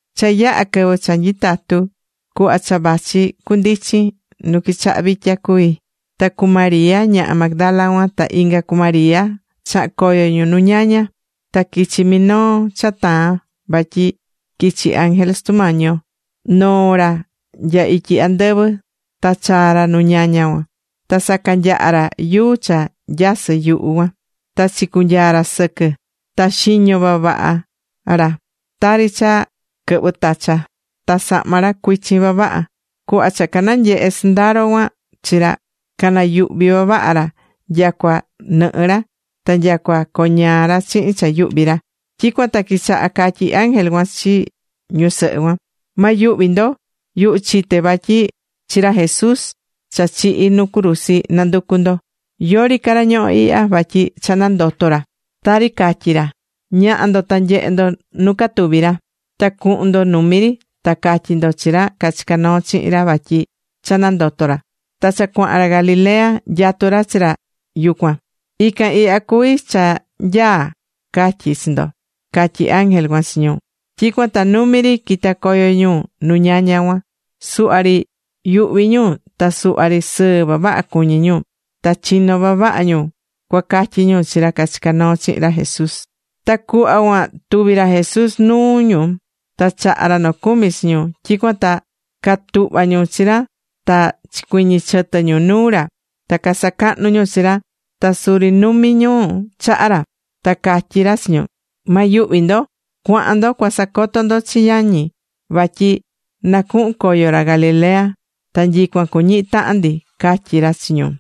Cha yaha̱ quɨvɨ cha nyitatu ñu, cuhva cha vachi cundichin, nu quichaha vitya cuví. Ta cu María ñaha Magdala cuan, ta inga cu María chaha̱n coyo ñu nu ñaña. Ta quichi minoo cha taa̱n vatyi quichi̱ ángel Sutu Mañi yo noo̱ ra nya ityi andɨvɨ, ta chaa̱ ra nu ñaña cuan. Ta sacanyaha̱ ra yuu cha nyasɨ̱ yuhu cuan, ta chicunyaa ra sɨquɨ. Ta xiño vavaha ra, tari cha quɨhvɨ tacha. Ta sahma ra cuichin vavaha. Cuhva cha cananyehe̱ sɨndaro cuan chi ra, canayuhví vavaha ra nyacua nɨhɨ́ ra, ta nyacua coñaa ra chihin cha yuhví ra. Tyicuan ta quichaha̱ catyí ángel cuan chi ñusɨhɨ cuan: ―Ma yuhvi ndo. Yuhu chité vatyi chi ra Jesús cha chihi̱ nu cruzi nanducú ndo. Yori ca ra ñohó ihya, vatyi cha nandoto̱ ra, tari catyi̱ ra. Ña̱ha ndo ta nye̱he ndo nu catuvi̱ ra. Ta cu̱hun ndo numi ri, ta ca̱tyi ndo chi ra cachica̱ noo chihin ra vatyi cha nandoto̱ ra, ta cha cuahan ra Galilea, nyatú ra chi ra yucuan. Ican ihya cuví cha nyaa catyi chi ndo ―catyí ángel cuan chi ñu. Tyicuan ta numi ri quita̱ coyo ñu nu ñaña cuan. Suhva ri yuhví ñu, ta suhva ri sɨɨ vavaha cuñí ñu. Ta chino̱ vavaha ñu cua catyi ñu chi ra cachica̱ noo chihin ra Jesús. Ta cuhva cuan tuvi̱ ra Jesús nuu ñu ta chaha̱ ra nocumi chi ñu. Tyicuan ta catuhva ñu chi ra ta chicuiñi chɨtɨ ñu nuu ra ta casacahnu ñu chi ra, ta suri numi̱ ñu chaha ra. Ta catyí ra chi ñu: ―Ma yuhvi ndo. Cua̱han ndo cua sacoto ndo chi yañi vatyi na cuhun coyo ra Galilea, ta nyicuan cuñihi tahan ndi ―catyí ra chi ñu.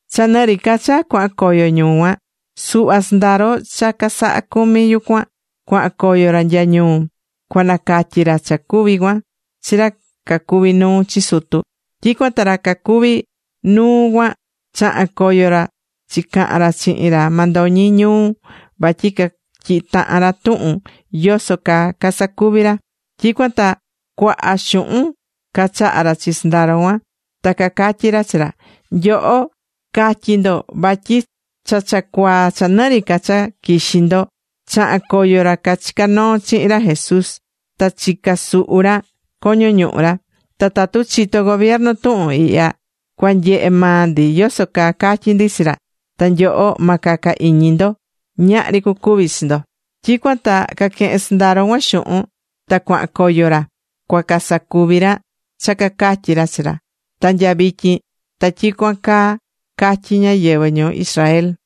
Cha nɨ ri ca cha cuahan coyo ñu cuan, suhva sɨndaro cha casaha̱ cumi yucuan, cuahan coyo ra nya ñuu, cua nacatyi ra cha cuvi̱ cuan chi ra cacuví nuu chi sutu. Tyicuan ta ra cacuví nuu cuan chaha̱n coyo ra chicahan ra chihin ra mandoñi ñuu vatyi catyihi tahan ra tuhun yoso caa casacuvi ra. Tyicuan ta cuaha xuhun cachaha̱ ra chi sɨndaro cuan. Ta cacatyí ra chi ra: ―Nyoho, ca̱tyi ndo vatyi cha cha cuaa cha nɨ ri ca cha quixí ndo, chaha̱n coyo ra cachica̱ noo chihin ra Jesús ta chicasuhu̱ ra coño ñuhu ra. Ta tatu chito̱ gobiernu tuhun ihya, cua nyehe maa ndi yoso caa catyi ndi chi ra, ta nyoho ma caca iñi ndo. Ñahri cucuvi chi ndo. Tyicuan ta caquehe̱n sɨndaro cuan xuhun, ta cuahan coyo ra cua casacuvi ra cha cacatyi̱ ra chi ra. Ta nya vityin ta tyicuan caa catyí ñáyɨvɨ ñuu Israel.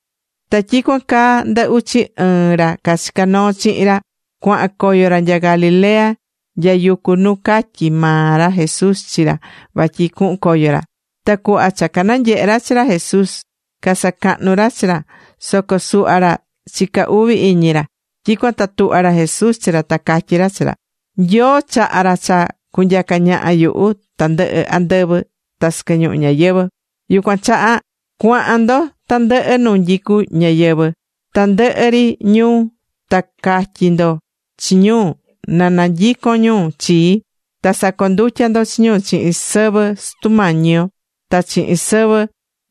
Ta tyicuan caa, ndɨ uchi ɨɨn ra cachica̱ noo chihin ra, cuahan coyo ra nya Galilea nya yucu nu catyi̱ maa ra Jesús chi ra vatyi cuhun coyo ra. Ta cuhva cha cananyehe̱ ra chi ra Jesús, casacahnu̱ ra chi ra soco suhva ra chica uvi iñi ra. Tyicuan ta tuhva̱ ra Jesús chi ra ta catyí ra chi ra: ―Nyoo chaha̱ ra cha cunyaca ñaha yuhu tandɨhɨ andɨvɨ ta sɨquɨ ñuhu ñayɨvɨ̱. Yucuan chaha, cua̱han ndo tandɨhɨ nu nyicú ñáyɨvɨ, tandɨhɨ ri ñuu, ta ca̱tyi ndo chi ñu na nanyicon ñu chii. Ta sa̱condutya ndo chi ñu chihin sɨvɨ Sutu yo Nyoo ta chihin sɨvɨ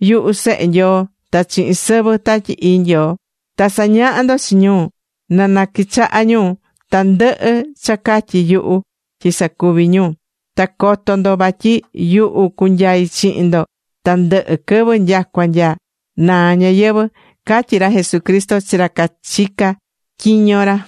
yuhu Sehe Nyoo, ta chihin sɨvɨ Tatyi Ii Nyoo. Ta sa̱ñaha ndo chi ñu na naquichaha ñu tandɨhɨ cha catyi̱ yuhu tyi sacuvi ñu. Ta co̱to ndo vatyi yuhu cunyai chihin ndo tandɨhɨ quɨvɨ nyacua nya naa ñayɨvɨ̱ ―catyí ra Jesucristo chi ra cachicá tyiño ra.